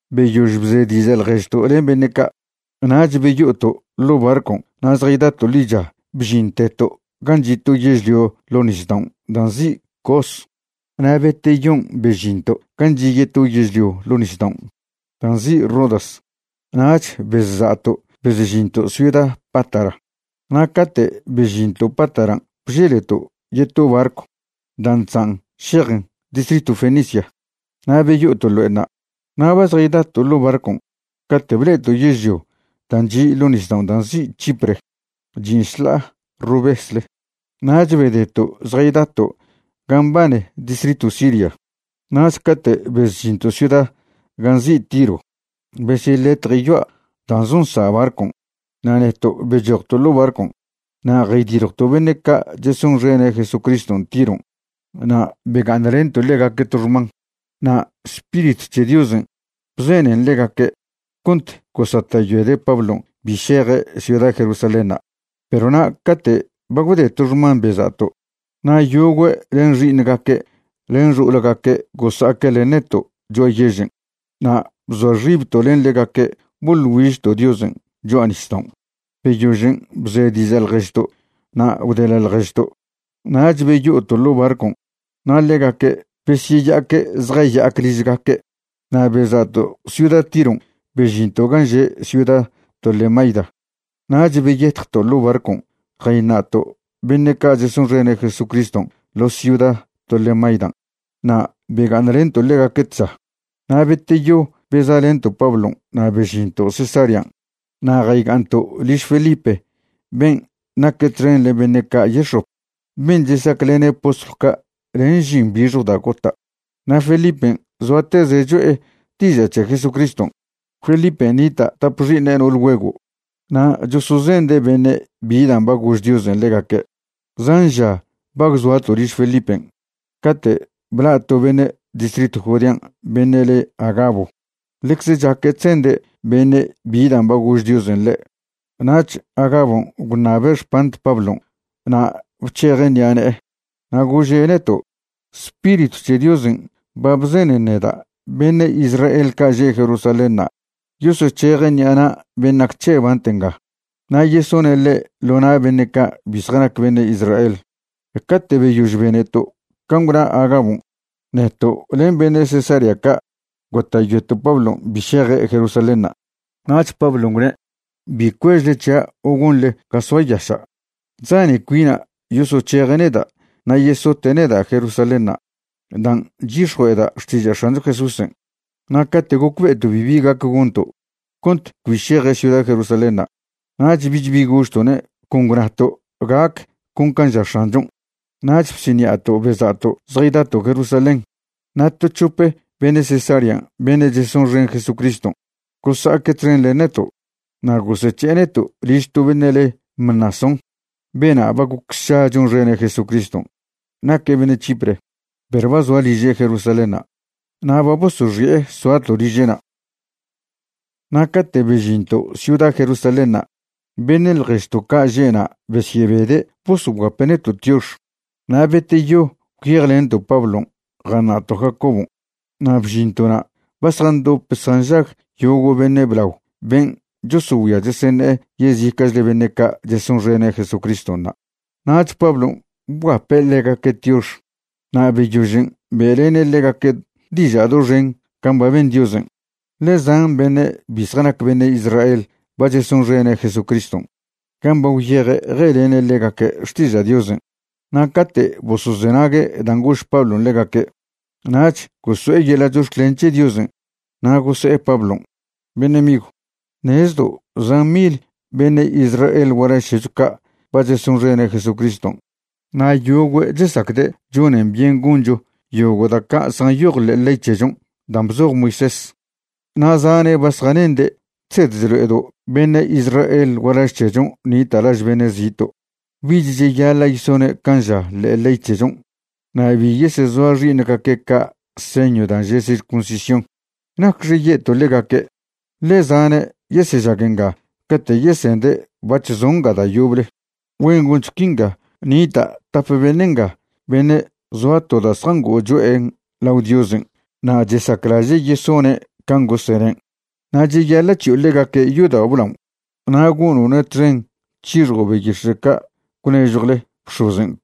Beyož bze diža' ḻježto' len beṉe' ca' nach beyo'oto' ḻo' barcon' na' zjaydato' ḻicha bžinteto' gan' chi' to yežlio ḻo' nisdaon' da' nzi' Cos, na' beteyon' bežinto' gan' chi' yeto yežlio ḻo' nisdaon' da' nzi' Rodas, nach bezsa'to' bezžinto' ciuda Pátara. Na' cate' bežinto' Pátaran' bželeto' yeto barcw dan' chzan' šejen distritw Fenicia, na' beyo'oto' ḻo'enṉa'. Na' ba zjaydato' ḻo' barcon' cate' ble'eto' yežlio dan' chi' ḻo' nisdao' dan' nzi' Chipre, chin' šḻa'a rovesle. Nach bedeto' zjaydato' gan' mbane distritw Siria. Nach cate' bezžinto' ciuda gan' nzi' Tiro besyeḻetje' yoa' da' zonsa' barcon' na' neto' bechojto' ḻo' barcon'. Na' jaydiljwto' beṉe' ca' chesonxene' Jesucriston' Tiron' na' bega'aṉlento' ḻegaque' to xman. Na' Spiritw c̱he Diosen' bzenen ḻegaque' cont gosata'yoede' Pablon' bi šeje' ciuda Jerusalénṉa'. Perw na' cate' ba gwde to xman beza'to', na' yogüe' len xi'iṉgaque' len xo'olgaque' gosa'aque' len neto' cho'a yežen' na' bzoa xibto' len ḻegaque' boḻ güižto' Diosen' cho'a nisdaon'. Beyožen' bze diža' ḻježto' na' gwdeḻa' ḻježto', nach beyo'oto' ḻo' barcon' na' ḻegaque' besyeya'aque' zjaya'ac ližgaque'. Na' beza'to' ciuda Tiron' bežinto' gan' že' ciuda Tolemaida. Nach beyetjto' ḻo' barcon' jayṉa'to' beṉe' ca' chesonxene' Jesucriston' ḻo ciuda Tolemaidan' na' bega'aṉlento' ḻegaque' tža. Na' beteyo beza'lento' Pablon' na' bežinto' Cesarean' na' jayga'aṉto' liž Felipe ben' naque' txen len beṉe' ca' yex̱op ben' chesaclene' postlw ca' len žin bixjw da' gota'. Na' Felipen' zoateze' cho'e diža' c̱he Jesucriston'. Felipen' nita' tap xi'iṉe' no'ol güego' na' chosozende' beṉe' bi dan' ba gož Diosen' ḻegaque'. Zan ža ba gwzoato' liž Felipen' cate' bla' to beṉe' distritw Judean' beṉe' le Agabo, ḻecze chaque' chzende' beṉe' bi dan' ba gož Diosen' ḻe'. Nach Agabon' gwṉabe' xpant Pablon' na' bc̱hejen' ṉi'a ne'e, na' gože' neto': ―Spiritw c̱he Diosen' ba bzenen neda' beṉe' Israel ca' že' Jerusalénṉa' yosoc̱heje' ṉi'a na' ben' nac c̱he' bant nga na' yesone' ḻe' ḻo na' beṉe' ca' bi zjanac beṉe' Israel. Cate' beyož beneto' can' gwna Agabon', neto' len beṉe' Cesarea ca' gota'yoeto' Pablon' bi šeje' Jerusalénṉa'. Nach Pablon' gwne': ―Bi cuežle c̱hia' o gonḻe ga soayaša'. Chzane cuina' yosoc̱heje' neda' na' yesote' neda' Jerusalénṉa' dan' chyix̱jue'eda' xtiža' X̱ancho Jesúsen'. Na' cate' gocbe'eto' bibi gac gonto' cont cbi šeje' ciuda Jerusalénṉa', nach bich bi gožto'ne', con gwnato': ―Gac con can' ža X̱anchon'. Nach bsiṉi'ato' beza'to' zjaydato' Jerusalén. Na' to c̱hope beṉe' Cesarean' beṉe' chesonxen Jesucriston' gosa'aque' txen len neto', na' gosec̱he'e neto' liž to beṉe' le Mnasón. Bena' ba goc sša chonxene' Jesucriston'. Naque' beṉe' Chipre, perw ba zoa liže' Jerusalénṉa'. Na' ba bosoxi'e soato' liže'na'. Na' cate' bežinto' ciuda Jerusalénṉa' beṉe' ḻježto' ca' že'na' besyebede' bosoguape' neto' tiox. Na' beteyo gwyejlento' Pablon' jaṉa'to' Jacobon', na' bžinto'na' ba zjandop zjanžag yogo' beṉe' blao ben' chosogüia cheseṉe'e yezica'chle beṉe' ca' chesonxene' Jesucriston' na'. Nach Pablon' bguape' ḻegaque' tiox na' beyožen' be'lene' ḻegaque' diža' doxen can' ba ben Diosen', ḻe zan beṉe' bi zjanac beṉe' Israel ba chesonxene' Jesucriston' gan' ba gwyeje' je'lene' ḻegaque' xtiža' Diosen'. Na' cate' bosozenague' dan' gož Pablon' ḻegaque', nach goso'e yeḻa' chox̱clen c̱he Diosen' na' gose'e Pablon': ―Beṉe' migw, ṉezdo' zan mil beṉe' Israel gualaž c̱hecho ca' ba chesonxene' Jesucriston' na' yogüe' chesacde' chonen byen goncho yogo' da' ca' zjanyoj ḻe'e ley c̱hechon' dan' bzoj Moisés. Na' zane' ba zjanende' chsed chlo'edo' beṉe' Israel gualaž c̱hechon' nita' laž beṉe' zito' bich cheyaḻa' yesone' can' ža ḻe'e ley c̱hechon' na' bi yesezoa' xi'iṉgaque' ca' señw dan' že' circuncisión. ¿Nacxe ye'to' ḻegaque'? ḻe zane' yesežag nga cate' yesende' bac̱h zo' nga da' yoble. Güen goncho quinga: nita' tap beṉe' nga beṉe' zoa to da' zjango'o cho'en lao Diosen' na' chesaclaže' yesone' can' gosenen'. Na' cheyaḻa' c̱hi'o ḻegaque' yodao' blaon' na' gono'ne' txen c̱hixjo' beyix̱e' ca' gwnežjwle bx̱ozen'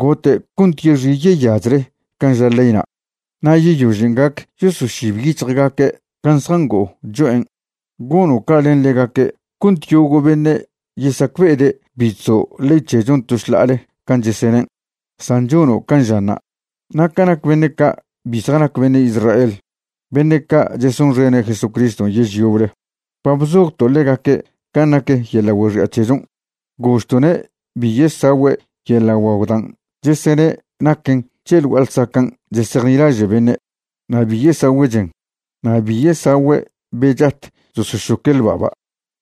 gote' cont yexi' yeyachle can' ža leyna'. Na' yeyožen' gac yosošib yic̱hjgaque' can' zjango'o cho'en. Gono' ca' len ḻegaque' cont yogo' beṉe' yesacbe'ede' bi chzo' ley c̱hechon' to šḻa'ale can' chesenen', san chono' can' žanṉa'. Na' ca nac beṉe' ca' bi zjanac beṉe' Israel beṉe' ca' chesonxene' Jesucriston' yež yoble, ba bzojto' ḻegaque' can' nac yeḻa' güexi'a c̱hechon', gožto'ne' bi yesagüe' yeḻa' guagw dan' chesene' naquen c̱he ḻ gua'a ḻsacan' chesejnilaže' beṉe', na' bi yesagüe' chen, na' bi yesagüe' be chat chosošoque' ḻba'ba',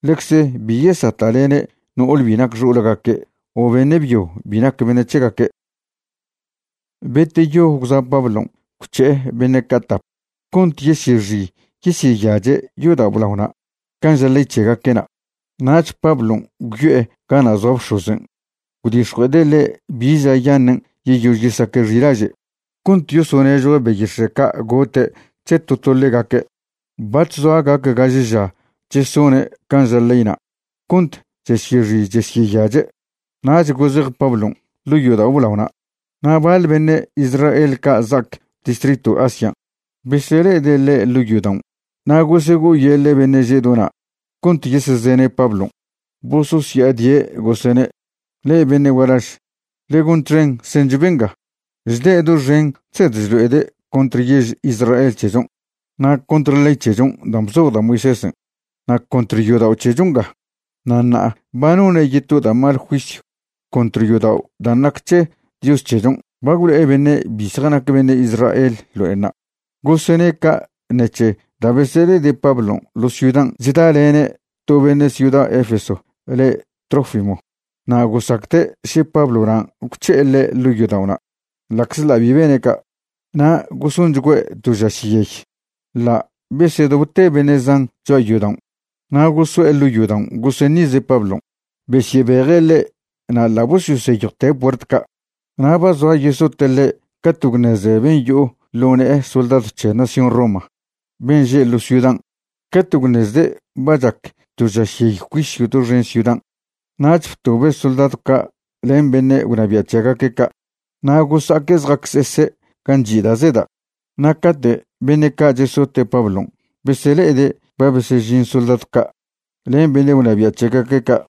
ḻecze bi yesata'lene' no'ole bi nac xo'olgaque' o beṉe' byo bi nac beṉe' c̱hegaque'. Beteyo gwza' Pablon' gwc̱he'e beṉe' ca' tap cont yesyexi yesyeyache' yodao' blaona' can' ža' ley c̱hegaque'na'. Nach Pablon' gwyo'e gana' zoa bx̱ozen' gwdix̱jue'ede' ḻe' bi ža yaṉen' yeyož yesaque' xi'laže' cont yosonežjue' beyix̱e' ca' gote' c̱he to to ḻegaque'. Bac̱h zoa gac gaže ža chesone' can' ža leyna' cont chesyexi chesyeyache', nach gozej Pablon' ḻo' yodao' blaona'. Na' baḻ beṉe' Israel ca' za'ac distritw Asian' besele'ede' ḻe' ḻo' yodaon' na' gosego'oyeḻe' beṉe' že' do na' cont yesezene' Pablon'. Bososya'adie', gosene': ―Le'e beṉe' gualaž, ḻe gon txen sencho benga. Chde' doxen chsed chlo'ede' contr yež Israel c̱hechon', na' contr ley c̱hechon' dan' bzoj da' Moisésen', na' contr yodao' c̱hecho nga. Na' ṉa'a ba none' yeto da' mal juisyw contr yodao' dan' nac c̱he Dios c̱hechon', ba gwlo'e beṉe' bi zjanac beṉe' Israel ḻo'enṉa'. Gosene' ca' ṉec̱he da' besele'ede' Pablon' ḻo ciudan' chdalene' to beṉe' ciuda Efeso le' Trófimo, na' gosacde' še Pablonan' gwc̱he'e ḻe' ḻo' yodao'na', ḻa'czḻa' bi bene' ca'. Na' gosonchgüe' to žašyey. Ḻa' besedobte beṉe' zan cho'a yodaon' na' goso'e ḻo' yodaon' goseṉize' Pablon', besyebeje' ḻe' na' ḻa' bosyoseyjwte' puert ca'. Na' ba zoa yesote' ḻe' cate' gwṉeze ben' yo'o ḻo ne'e soldadw c̱he nación Roma ben' že' ḻo ciudan'. Cate' gwṉezde' ba chac to žašyey juisyw doxen ciudan', nach btobe' soldadw ca' len beṉe' gwnabia' c̱hegaque' ca', na' gosa'aque' zja'acsese' gan' chi' da' zeda'. Na' cate' beṉe' ca' chesote' Pablon' besele'ede' ba besežin soldadw ca' len beṉe' gwnabia' c̱hegaque' ca',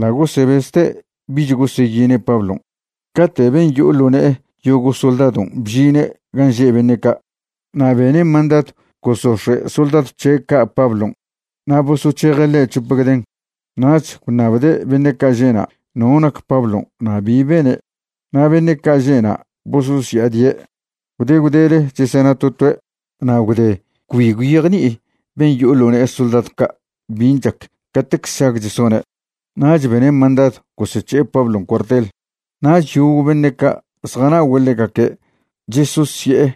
ḻa' gosebezte' bich goseyine' Pablon'. Cate' ben' yo'o ḻo' ne'e yogo' soldadon' bžine' gan' že' beṉe' ca', na' bene' mandadw gosox̱e' soldadw c̱he' ca' Pablon' na' bosoc̱heje' ḻe' c̱hope gden. Nach gwṉabde' beṉe' ca' že'na' no nac Pablon' na' bi bene'. Na' beṉe' ca' že'na' bososya'adie', gwde gwdele chesena to toe'. Na' gwde cbi gwyejni'i ben' yo'o ḻo' ne'e soldadw ca' bin' chac catec sšag chesone', nach bene' mandadw gosec̱he'e Pablon' cuartel. Nach yogo' beṉe' ca' zjana'ogüe' ḻegaque' chesosye'e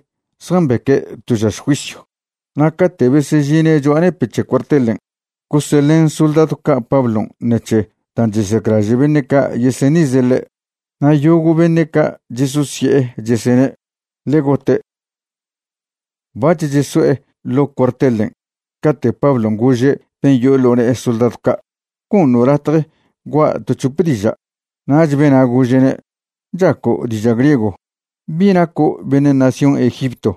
zjambeque' to žaš juisyw. Na' cate' besežine' cho'a nepe' c̱he cuartelen' goseḻen soldadw ca' Pablon' ṉec̱he dan' chesaclaže' beṉe' ca' yeseṉize' ḻe', na' yogo' beṉe' ca' chesosye'e, chesene': ―Ḻe gote'. Bac̱h cheso'e ḻo' cuartelen' cate' Pablon' gože' ben' yo'o ḻo' ne'e soldadw ca': ―¿Goṉo' latje gua' to c̱hope diža'? Nach bena' gože'ne': ―¿Chaco' diža' griego? ¿Bi naco' beṉe' nación Egipto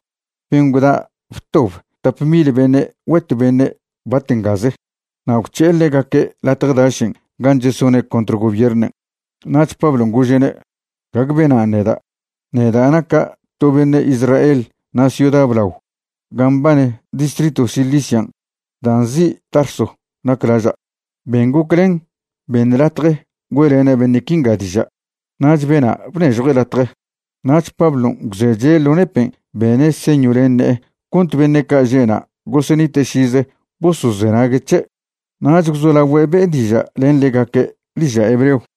ben' gwda btob tap mil beṉe' güet beṉe' bat ngaze na' gwc̱he'e ḻegaque' latje dašen' gan' chesone' contr gobiernen'? Nach Pablon' gože'ne': ―Gague benan' neda'. Neda' naca' to beṉe' Israel na' ciuda blao gan' mbane distritw Cilician' dan' nzi' Tarso nac laža'. Ben goclen beṉ latje güe'lena' beṉe' quinga diža'. Nach bena' bnežjue' latje. Nach Pablon' gwzeche' ḻo nepen' bene' señw len ne'e cont beṉe' ca' že'na' gosenite' šize bosozenague' c̱he'. Nach gwzolagüe' be'e diža' len ḻegaque' diža' hebreo.